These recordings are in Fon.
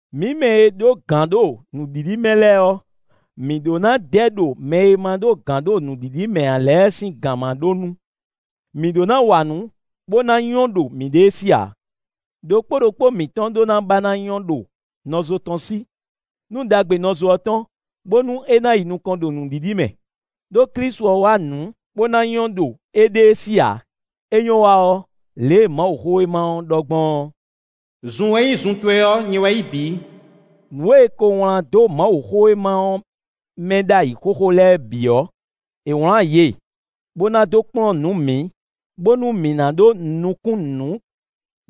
Mǐ mɛ e ɖó gǎn ɖo nǔɖiɖi mɛ lɛ́ɛ ɔ́, mǐ ɖó ná dɛ ɖo mɛ e ma ɖó gǎn ɖo nǔɖiɖi mɛ ǎ lɛ́ɛ sín gǎnmaɖó nu; mǐ ɖó ná wa nǔ bó ná nyɔ́ ɖo mǐɖée sí ǎ. Đokpó ɖokpó mǐtɔn ɖó ná ba ná nyɔ́ ɖo nɔzo tɔn sí, nú ɖagbe nɔzo ɔ́ tɔn, bónú é ná yi nukɔn ɖo nǔɖiɖi mɛ. Đó Klísu ɔ́ wa nǔ bó ná nyɔ́ ɖo éɖée sí ǎ; é nyɔ́ wa ɔ́, lě e Mawuxówéma ɔ́ ɖɔ gbɔn ɔ́: “Zun e nyí zun towe ɔ́, nyɛ wɛ yí bǐ.” Nǔ e è ko wlán dó Mawuxówéma ɔ́ mɛ ɖ'ayǐ xóxó lɛ́ɛ bǐ ɔ́, è wlán yě, bó ná dó kplɔ́n nǔ mǐ, bónú mǐ ná ɖó nukún nǔ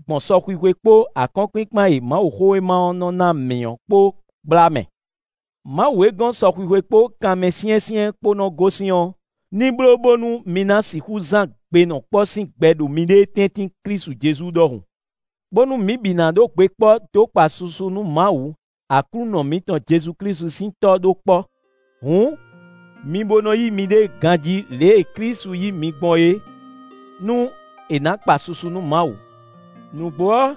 gbɔn sɔxwixwe kpó akɔ́nkpinkpan e Mawuxówéma ɔ́ nɔ ná mǐ ɔ́ kpó gbla mɛ. Mawu e gɔ́n sɔxwixwe kpó kanmɛsyɛ́nsyɛ́n kpó nɔ gosín ɔ́, ní bló bónú mi ná sixú zán gbenɔkpɔ́ sín gbɛ ɖo miɖée tɛ́ntin Klísu Jezu ɖɔhun. Bónú mi bǐ ná ɖó gbe kpɔ́ dó kpa susu nú Mawu, Aklúnɔ mǐtɔn Jezu Klísu sín Tɔ́ ɖó kpɔ́. Hǔn, mi bo nɔ yí miɖée ganjí lě e Klísu yí mi gbɔn é, nú è nǎ kpa susu nú Mawu. Nǔgbó ɔ́,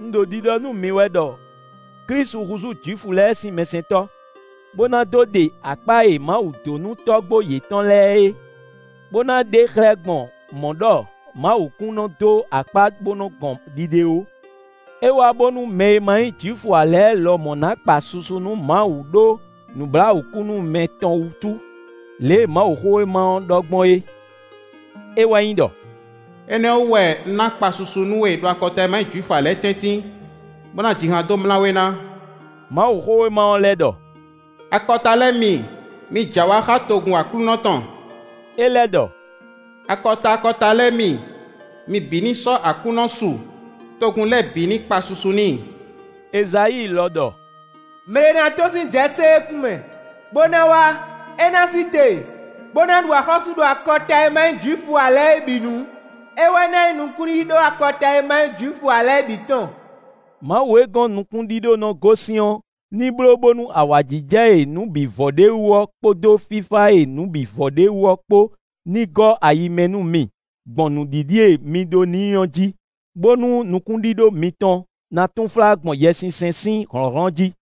un ɖo ɖiɖɔ nú mi wɛ ɖɔ Klísu húzú Jwifu lɛ́ɛ sín mɛsɛntɔ́, bó ná dó ɖe akpá e Mawu dó nú tɔ́gbó yětɔn lɛ́ɛ é, bó ná ɖe xlɛ́ gbɔn mɔ̌ ɖɔ Mawu kún nɔ́ dó akpá bó nɔ́ gɔn ɖiɖe ó. É wá bónú mɛ e ma nyí Jwifu ǎ lɛ́ɛ lɔmɔ̌ ná kpa susu nú Mawu ɖó nǔbláwǔkúnúmɛ tɔn wútu; lě e Mawuxówéma ɔ́ ɖɔ gbɔn é; é wɛ nyí ɖɔ: “Énɛ́ ɔ́ wú wɛ un ná kpa susu nú we ɖo akɔta e ma nyí Jwifu ǎ lɛ́ɛ tɛ́ntin, bó ná ji han dó mlá we ná.” Mawuxówéma ɔ́ lɛ́ ɖɔ: “Akɔta lɛ́ɛ mi, mi jɛ awǎ xá togun Aklúnɔ tɔn!” É lɛ́ ɖɔ: “Akɔta akɔta lɛ́ɛ mi, mi bǐ ní sɔ́ Aklúnɔ su, togun lɛ́ɛ bǐ ní kpa susu n'i!” Ezayíi lɔ ɖɔ: “Mɛ ɖé ná tɔ́n sín Jɛsée kún mɛ, bó ná wá; é ná sí te, bó ná ɖu axɔ́sú ɖo akɔta e ma nyí Jwifu ǎ lɛ́ɛ bǐ nu; é wɛ ná nyí nukúnɖíɖó akɔta e ma nyí Jwifu ǎ lɛ́ɛ bǐ tɔn.” Mawu e gɔ́n nukúnɖíɖó nɔ gosín ɔ́, ní bló bónú awǎjijɛ e nǔ bǐ vɔ ɖ'é wú ɔ́ kpódó fífá e nǔ bǐ vɔ ɖ'é wú ɔ́ kpó ní gɔ́ ayi mɛ nú mi gbɔn nǔɖiɖi e mi ɖó n'i ɔ́ jí, bónú nukúnɖíɖó mitɔn ná túnflá gbɔn Yɛsinsɛn sín hlɔ̌nhlɔ́n jí.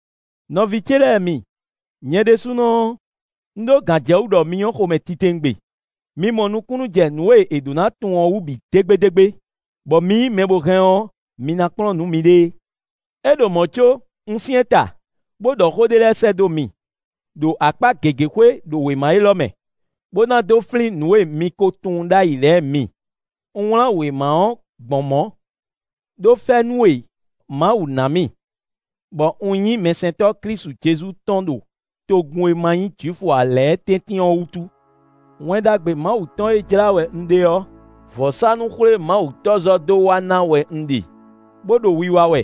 Nɔví ce lɛ́ɛ mi, nyɛ ɖésúnɔ ɔ́, un ɖó gǎnjɛwú ɖɔ mi nyɔ́ xomɛ titewungbe. Mi mɔ nukúnnú jɛ nǔ e è ɖǒ ná tunwun ɔ́ wú bǐ dégbédégbé, bɔ mi nyí mɛ bó hɛn ɔ́, mi ná kplɔ́n nǔ miɖée. É ɖo mɔ̌ có, un syɛ́n ta, bó ɖɔ xó ɖé lɛ́ɛ sɛ́ dó mi, ɖo akpá gěgé xwé ɖo wěma élɔ́ mɛ, bó ná dó flín nǔ e mi ko tunwun ɖ'ayǐ lɛ́ɛ mi. Un wlán wěma ɔ́ gbɔn mɔ̌, ɖó fɛ́nú e Mawu ná mì, bɔ un nyí mɛsɛntɔ́ Klísu Jezu tɔn ɖo togun e ma nyí Jwifu ǎ lɛ́ɛ tɛ́ntin ɔ́ wútu. Wɛn Ɖagbe Mawu tɔn e jlá wɛ un ɖe ɔ́, vɔ̌sánú-xwlémawutɔ́zɔ́ dó wa ná wɛ un ɖe, bó ɖo wiwa wɛ,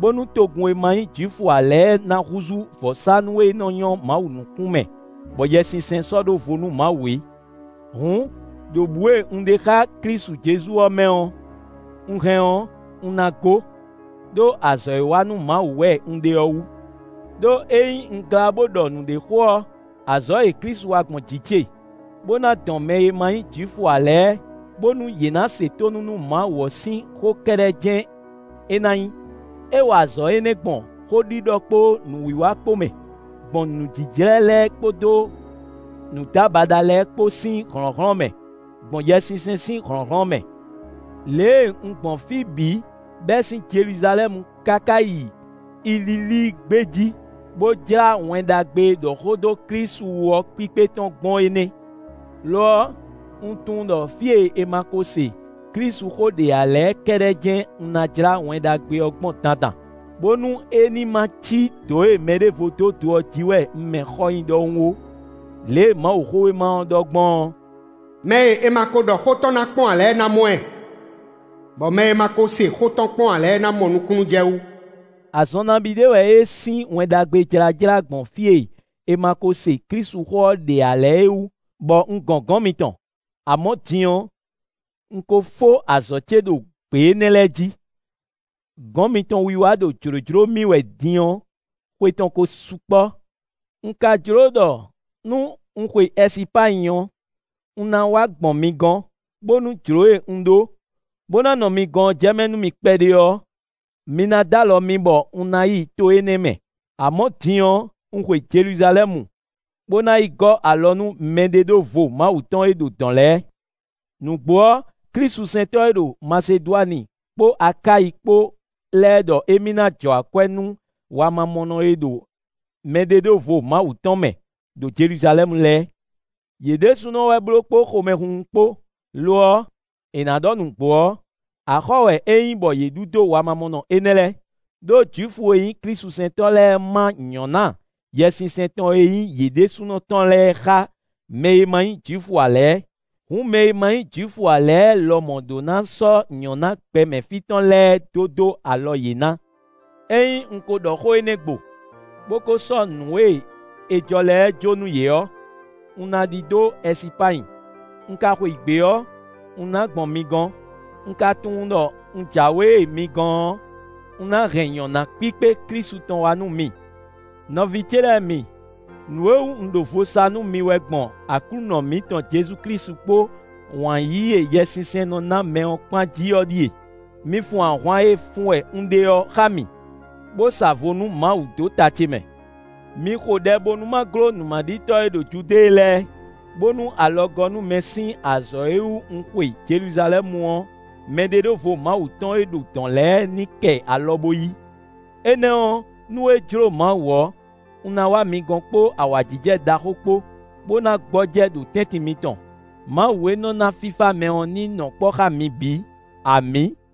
bónú togun e ma nyí Jwifu ǎ lɛ́ɛ ná húzú vɔ̌sánú e nɔ́ nyɔ́ Mawu nukún mɛ, bɔ Yɛsinsɛn sɔ́ ɖó vo nú Mawu é. Hǔn, ɖo bǔ e un ɖe xá Klísu Jezu ɔ́ mɛ ɔ́, un hɛn ɔ́, un ná gó, ɖó azɔ̌ e wa nú Mawu wɛ un ɖe ɔ́ wú. Đó ényí un glá bó ɖɔ nǔɖé xó ɔ́, azɔ̌ e Klísu wa gbɔn jǐ ce, bó ná dɔn mɛ e ma nyí Jwifu ǎ lɛ́ɛ, bónú yě ná se tónú nú Mawu ɔ́ sín xó kɛ́ɖɛ́ jɛ́n é ná nyí; é wa azɔ̌ énɛ́ gbɔn xóɖiɖɔ kpó nǔwiwa kpó mɛ, gbɔn nǔjíjlɛ́ lɛ́ɛ kpódó nǔdábaɖa lɛ́ɛ kpó sín hlɔ̌nhlɔ́n mɛ; gbɔn Yɛsinsɛn sín hlɔ̌nhlɔ́n mɛ. Lě e un gbɔn fí bǐ bɛ́ sín Jeluzalɛ́mu káká yi Ililíi gbé jí, bó jlá Wɛn Ɖagbe e ɖɔ xó dó Klísu wú ɔ́ kpíkpé tɔn gbɔn é nɛ́. Lo ɔ́, un tunwun ɖɔ fí e è ma ko se Klísuxó ɖe ǎ lɛ́ɛ kɛ́ɖɛ́ jɛ́n un ná jlá Wɛn Ɖagbe ɔ́ gbɔn dandan, bónú é ní ma cí dǒ e mɛɖěvo dó do ɔ́ jí wɛ un mɛ xɔ nyi ɖɔhun ó. Lě e Mawuxówéma ɔ́ ɖɔ gbɔn ɔ́: “Mɛ e è ma ko ɖɔ xó tɔn ná kpɔ́n ǎ lɛ́ɛ ná mɔ ɛ, bɔ mɛ e ma ko se xó tɔn kpɔn ǎ lɛ́ɛ ná mɔ nukúnnú jɛ wú.” Azɔn nabí ɖé wɛ é sín Wɛn Ɖagbe jlájlá gbɔn fí e è ma ko se Klísuxó ɔ́ ɖe ǎ lɛ́ɛ é wú, bɔ un gɔn gɔ̌n mitɔn. Amɔ̌, din ɔ́, un ko fó azɔ̌ ce ɖo gbě énɛ́ lɛ́ɛ jí. Gɔ̌n mitɔn wiwa ɖo jlǒjló mì wɛ din ɔ́, xwe tɔn ko sukpɔ́. Un ka jló ɖɔ nú un xwe Ɛsipányi ɔ́, un ná wá gbɔn mi gɔ́n, bónú jló e un ɖó, bó ná nɔ mi gɔ́n ɔ́ jɛmɛ nú mì kpɛɖé ɔ́, mi ná d'alɔ mì bɔ un ná yi to énɛ́ mɛ. Amɔ̌, din ɔ́, un xwe Jeluzalɛ́mu, bó ná yi gɔ́ alɔ nú mɛɖeɖóvo Mawu tɔn e ɖo dɔ̌n lɛ́ɛ. Nǔgbó ɔ́, klísusɛntɔ́ e ɖo Masedwani kpó Akáyi kpó lɛ́ɛ ɖɔ émí ná jɔ akwɛ́ nú wamamɔnɔ e ɖo mɛɖeɖóvo Mawu tɔn mɛ, ɖo Jeluzalɛ́mu lɛ́ɛ. Yě ɖésúnɔ wɛ bló kpó xomɛhunhun kpó; lo ɔ́, è nǎ ɖɔ nǔgbó ɔ́, axɔ́ wɛ é nyí bɔ yě ɖu dó wamamɔnɔ énɛ́ lɛ́ɛ. Đó Jwifu e nyí klísusɛntɔ́ lɛ́ɛ má nyɔ̌ná Yɛsinsɛn tɔn e nyí yě ɖésúnɔ tɔn lɛ́ɛ xá mɛ e ma nyí Jwifu ǎ lɛ́ɛ. Hǔn mɛ e ma nyí Jwifu ǎ lɛ́ɛ lɔmɔ̌ ɖó ná sɔ́ nyɔ̌ná gbɛmɛ fí tɔn lɛ́ɛ dó dó alɔ yě ná. Ényí un ko ɖɔ xó énɛ́ gbo, bó ko sɔ́ nǔ e è jɔ lɛ́ɛ jó nú yě ɔ́, un ná ɖidó Ɛsipányi; un ka xweyǐgbe ɔ́, un ná gbɔn mi gɔ́n. Un ka tunwun ɖɔ un jǎwe mi gɔn ɔ́, un ná hɛn nyɔ̌ná kpíkpé Klísu tɔn wá nú mi. Nɔví ce lɛ́ɛ mi, nǔ e wú un ɖo vo sa nú mi wɛ gbɔn Aklúnɔ mǐtɔn Jezu Klísu kpó wǎn yíyí e Yɛsinsɛn nɔ ná mɛ ɔ́ kpán jí ɔ́ ɖíe: mi fun ahwan e fun wɛ un ɖe ɔ́ xá mì, bó sa vo nú Mawu dó ta ce mɛ. Mi xo ɖɛ bónú ma gló nǔmaɖitɔ́ e ɖo Judée lɛ́ɛ, bónú alɔgɔ́númɛ sín azɔ̌ e wú un xwe Jeluzalɛ́mu ɔ́, mɛɖeɖóvo Mawu tɔn e ɖo dɔ̌n lɛ́ɛ ní kɛ alɔ bó yí. Énɛ́ ɔ́, nú é jló Mawu ɔ́, un ná wá mi gɔ́n kpó awǎjijɛ ɖaxó kpó, bó ná gbɔjɛ́ ɖo tɛ́ntin mitɔn. Mawu e nɔ ná fífá mɛ ɔ́ ní nɔ kpɔ́ xá mi bǐ! Amǐ!